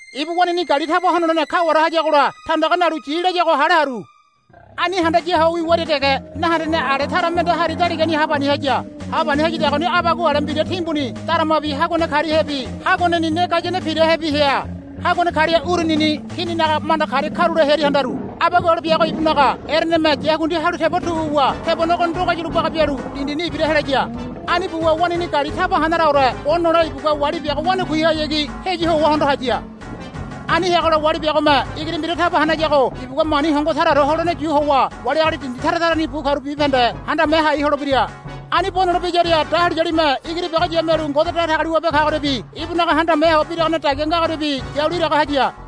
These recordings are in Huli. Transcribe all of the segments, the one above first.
Ibu waneigini gali taba honolene kaware hayagola tandaga nalu yi layago hale haru. Ani handaya ho wiwaria dege nahendene ale tara mende hari daligani hapani haya. Hapani hayadagoni abagua ale mbira timbuni daramabi haguane kariahebi haguaneni ne gayane pirahebi hea. Haguane karia urunini kininaga manda karia karule hearia handaru. Abagua ale biago ibunaga ereneme yakundi halu tebo tu wuwa tebonego ndogayulo baga bialu dindini ibira helaya. Ani buwa waneigini gali taba hanaraore bo nole ibugua wali biago wanakuihayagi heyu howa hondo haya. Ani heagola wali biagome igiri mbira taba hanayago ibugua mani hongo taraore holene yu howa wali agali dindi tara tarani bu karu bibahende handame hai holebira. Ani bo nole biyaria dahuliyalime igiri biago yamialu Ngode Datagaliwabe kagoriabi ibunaga handame ho biragane dagia ngagoriabi yalu iraga haya.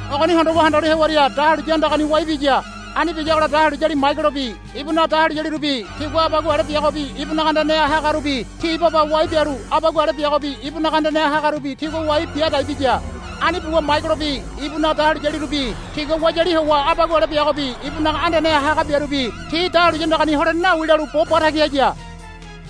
Ogoni hondowa handalu hewaria dahuliya andagani wai biya. Ani biyagola dahuliyali Maigelobi ibunaga dahuliyalirubi tigua abagua ale biagobi ibunaga andaneha hagarubi ti baba wai bialu abagua ale biagobi ibunaga andaneha hagarubi tigua wai bia dai biya. Ani buwa Maigelobi ibunaga dahuliyalirubi tigua wayali howa abagua ale biagobi ibunaga andaneha haga biarubi ti dahuliya andagani holene nawi lalu bo batagi haya.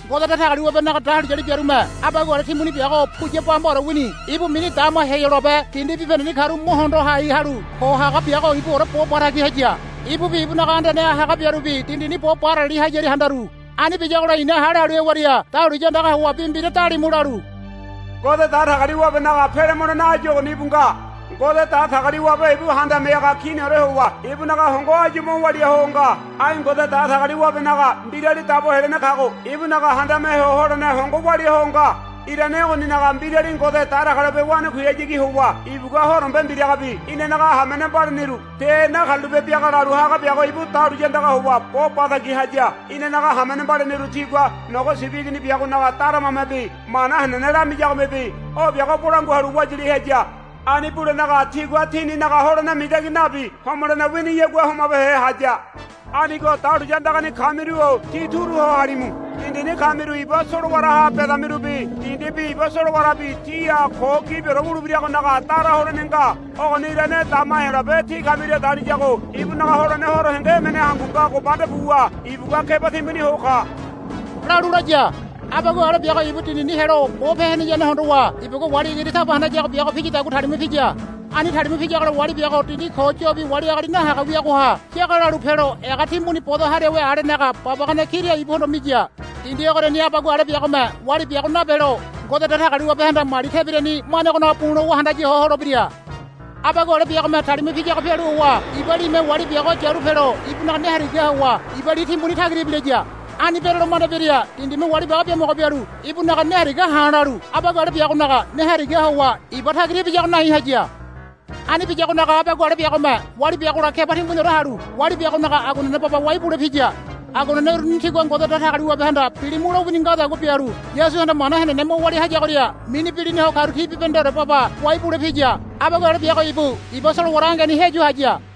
Ngode Datagaliwabenaga dahuliyali biarume abagua ale timbuni biago puya bambaore wini ibu mini dama Heyolabe dindi bibahendeni karu mo hondo hai halu ko haga biago ibuore bo batagi haya. Ibubi ibunaga andaneha haga biarubi dindini bo barali hayaria handaru. Ani biyagola i̱na hale halu hewaria dahuliya andaga howa bi mbira dalimu lalu, Ngode Datagaliwabenaga pele mulene áyu ogoni íbu nga. Ngode Datagaliwabe ibu Handame Haga Kiniore howa ibunaga hongo áyu mo walia ho nga. Ai Ngode Datagaliwabenaga Mbirali Dabo Helene kago ibunaga handame ho holene hongo walia ho nga. Irane ogoninaga mbirali Ngode Datagaliwabe wanakuihayagi howa ibugua horombe mbiragabi inanaga hamene mbaliniru ti nakarulape biaga lalu haga biago ibu dahuliya andaga howa bo batagi haya. Inanaga hamene mbaliniru tigua Nogo Sibi Igini biagonaga daramamebi mana henene lamiyagomebi o biago bolangua halu wayali haya. Ani bulenaga tigua tininaga holene mitangi nabi homolene winiyagua homabehe haya. Anigo dahuliya andagani kamiru-o tí turu ho halimu. Dindini kamiru iba solowaraha bedamirubi dindibi iba solowarabi tíha ko gibiore wulebiragonaga dara holene nga. Ogoni irane dama Heyolabe tí kamiria daliyago ibunaga holene horo henge emene hangu ngago manda buwa ibugua keba timbuni ho ka, lalu laya. Abagua ale biago ibu dindini helo bope heneyane hondowa ibugua wali igiri taba hanayago biago piyadagua talima piya. Ani talima piyagola wali biago dindi ko yobi wali agali nahaga wiagoha yaga lalu pelo ega timbuni bodo hariawe alenaga babagane kira ibuhondo miya. Dindi ogoriani abagua ale biagome wali biago nabelo Ngode Datagaliwabehanda mali tebirani manegonaga bu̱ lowa handaya ho holebira. Abagua ale biagome talima piyago pialu howa iba lime wali biago yalu pelo ibunaga ne harigaha howa iba li timbuni tagira ibilaya. Ani berolo manda biaria dindime wali biago biamogo bialu ibunaga ne haria ha̱ lalu abagua ale biagonaga ne harigaha howa iba tagira ibiyago nai haya. Ani biyagonaga abagua ale biagome wali biagola keba timbuniore halu wali biagonaga aguanene baba wai bule piya. Aguanene uruni tigua Ngode Datagaliwabehanda, Bilimu, lowini ngadagua bialu Yasuhanda mana henene mo walia hayagoria mini bilina ho karu ti bibahendeore baba wai bule piya. Abagua ale biago ibu iba solowara angeni heyu haya.